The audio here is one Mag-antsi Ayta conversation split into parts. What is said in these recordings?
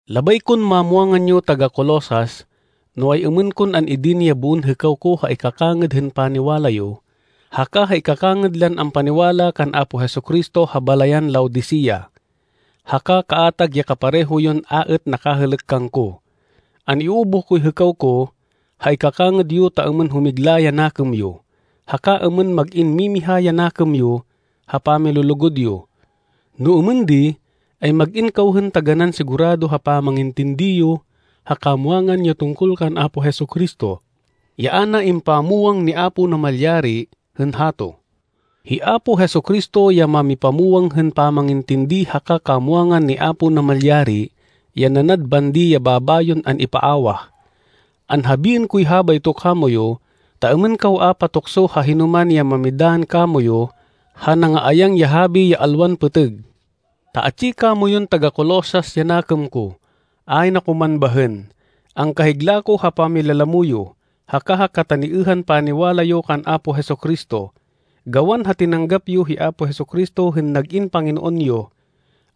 Labay kon mamwangan yon taga-Colosas, no ay-êmên kon an-idin ya boon hêkaw ko ha ikakangêd hên paniwala yo, haka ha ikakangêd lan ampaniwala kan Apo Jesu-Cristo ha balayan Laodicea, haka kaatag ya kapareho yon a êt nakahêlêk kangko. An-iubuh koy hêkaw ko ha ikakangêd yo ta êmên humigla ya nakêm yo, haka êmên mag-in mimiha ya nakêm yo ha pamilulugud yo. No êmên di, ay mag-in kaw hên taganán sigurado ha pamangintindi yo ha kamwangan ya tungkol kan Apo Jesu-Cristo, ya a na impamwang ni Apo Namalyari hên hato. Hi Apo Jesu-Cristo ya mamipamwang hên pamangintindi haka kamwangan ni Apo Namalyari ya nanad bandi ya babayon an-ipaawah. Anhabiên koy habayto kamoyu ta êmên kaw a patukso ha hinoman ya mamidann kamoyu ha nangaayang ya habi ya alwan pêtêg. Ta atsi kamoyun taga-Colosas ya nakêm ko, ayn ako man bahên. Angkahigla ko ha pamilalamo yo, haka ha kataniêhan paniwala yo kan Apo Jesu-Cristo. Gawan ha tinanggap yo hi Apo Jesu-Cristo hên nag-in Panginoon yo,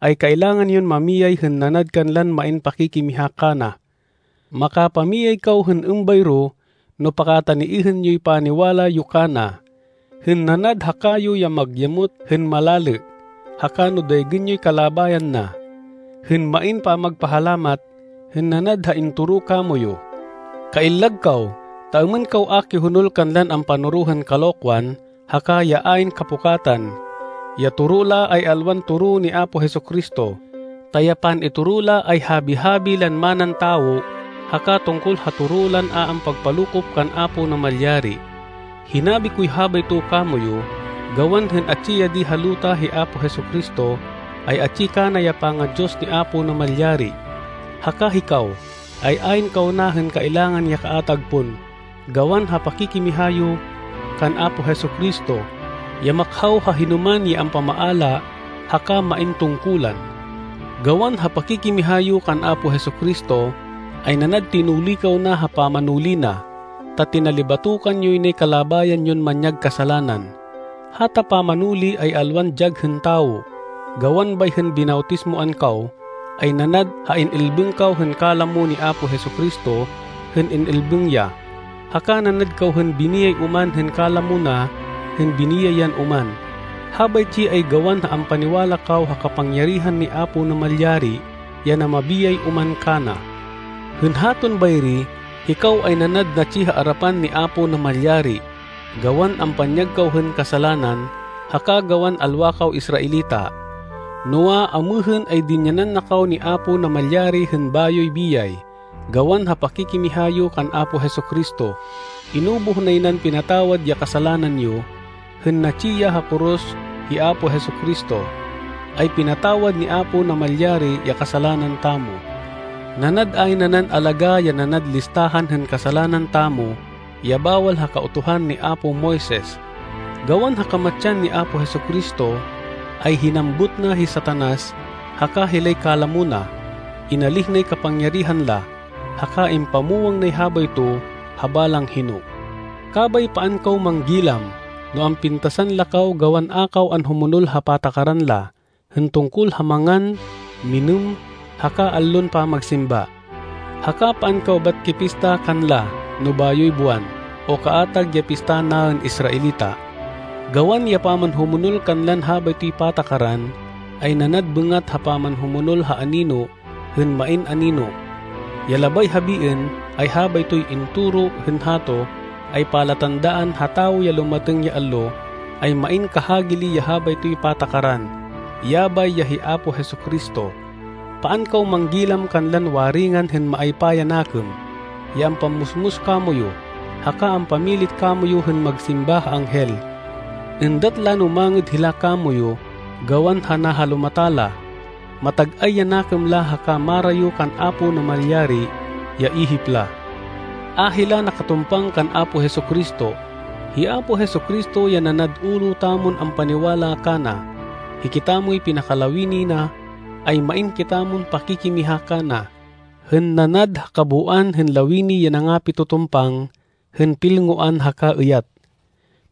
ay kailangan yon mamiyay hên nanad kanlan main pakikimiha kana. Makapamiyay kaw hên êmbayro no pakataniêhên yoy paniwala yo kana, hên nanad ha kayo ya magyamot hên malalê, haka no daygên yoy kalabayan na, hên main pamagpahalamat, hên nanad ha intoro kamoyu. Kaillag kaw, ta êmên kaw a kihonol kanlan ampanoro hên kalokwan haka ya ayn kapukatan. Ya toro la ay alwan toro ni Apo Jesu-Cristo, ta ya pan-itoro la ay habi-habi lan manan tawo haka tungkol ha toro lan a ampagpalokop kan Apo Namalyari. Hinabi koy habayto kamoyu gawan hên atsi ya di ha luta hi Apo Jesu-Cristo, ay atsi kana ya panga-Diyos ni Apo Namalyari. Haka hikaw, ay ayn kaw na hên kailangan ya kaatag pon, gawan ha pakikimiha yo kan Apo Jesu-Cristo, ya makhaw ha hinoman ya ampamaala haka main tungkulan. Gawan ha pakikimiha yo kan Apo Jesu-Cristo, ay nanad tinuli kaw na ha pamanuli na, ta tinalibatokan yoy nay kalabayan yon manyag kasalanan. Hata pamanuli ay alwan dyag hên tawo. Gawan bay hên binawtismoan kaw, ay nanad ha in-ilbêng kaw hên kalamo ni Apo Jesu-Cristo hên in-ilbêng ya, haka nanad kaw hên biniyay oman hên kalamo na hên biniyay yan oman. Habaytsi ay gawan ha ampaniwala kaw ha kapangyarihan ni Apo Namalyari ya namabiyay oman kana. Hên haton bayri, hikaw ay nanad natsi ha arapan ni Apo Namalyari, gawan ampanyag kaw hên kasalanan, haka gawan alwa kaw Israelita. Noa, amêhên ay dinyanan na kaw ni Apo Namalyari hên bayoy biyay, gawan ha pakikimiha yo kan Apo Jesu-Cristo. Inubuh nay nan pinatawad ya kasalanan yo. Hên natsi ya ha koros hi Apo Jesu-Cristo, ay pinatawad ni Apo Namalyari ya kasalanan tamo. Nanad ayn nanan alagá ya nanad listahan hên kasalanan tamo ya bawal ha Kautuhan ni apo Moises. Gawan ha kamatsan ni Apo Jesu-Cristo, ay hinambut na hi Satanas haka hilay kalamo na. Inalíh nay kapangyarihan la, haka impamwang nay habayto ha balang hino. Kabay paan kaw manggilam, no ampintasan la kaw gawan a kaw anhumonol ha patakaran la, hên tungkol ha mangan, minêm, haka allon pamagsimba. Haka paan kaw bat kipista kanla no bayoy buwan, o kaatag ya pista naên Israelita. Gawan ya pamanhumonol kanlan habaytoy patakaran, ay nanad bêngat ha pamanhumonol ha anino hên main anino. Ya labay habiên ay habaytoy intoro hên hato ay palatandaan ha tawo ya lumatêng ya allo ay main kahagili ya habaytoy patakaran. Yabay ya hi Apo Jesu-Cristo. Paan kaw manggilam kanlan waringan hên maaypa ya nakêm, ya ampammusmus kamoyu, haka ampamilit kamoyu hên magsimba ha anghel. Êndat la no mangêd hila kamoyu gawan ha nahalumata la. Matag-ay ya nakêm la haka marayo kan Apo Namalyari ya ihip la. A hila nakatumpang kan Apo Jesu-Cristo. Hi Apo Jesu-Cristo ya nanad ulo tamon ampaniwala kana. Hikitamoy pinakalawini na, ay main kitamon pakikimiha kana, hên nanad ha kabooan hên lawini ya nangapitutumpang hên pilngoan haka êyat.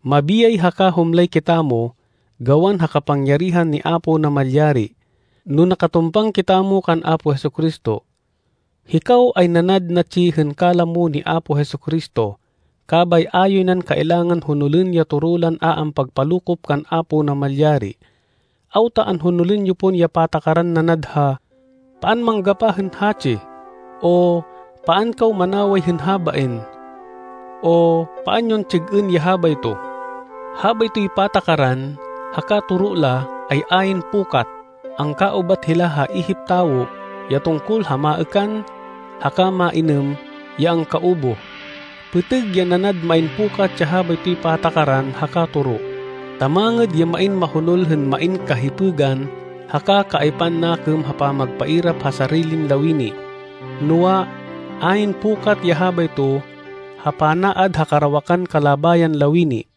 Mabiyay haka humlay kitamo, gawan ha kapangyarihan ni Apo Namalyari, no nakatumpang kitamo kan Apo Jesu-Cristo. Hikaw ay nanad natsi hên kalamo ni Apo Jesu-Cristo, kabay a yoy nan kailangan honolên ya toro lan a ampagpalokop kan Apo Namalyari. Awta anhonolên yo pon ya patakaran nanad ha, “Paan manggapá hên hatsi,” o “Paan kaw manaway hên habain,” o “Paan yon tsig-ên ya habayto.” Habaytoy patakaran, haka toro la, ay ayn pukat. Angkaubat hila ha ihip tawo, ya tungkol ha maêkan, haka mainêm ya angkaubuh. Pêtêg ya nanad main pukat ya habaytoy patakaran haka toro, ta mangêd ya main mahonol hên main kahipêgan haka kaaypaan nakêm ha pamagpairap ha sarilin lawini, noa, ayn pukat ya habayto ha panaad ha karawakan kalabayan lawini.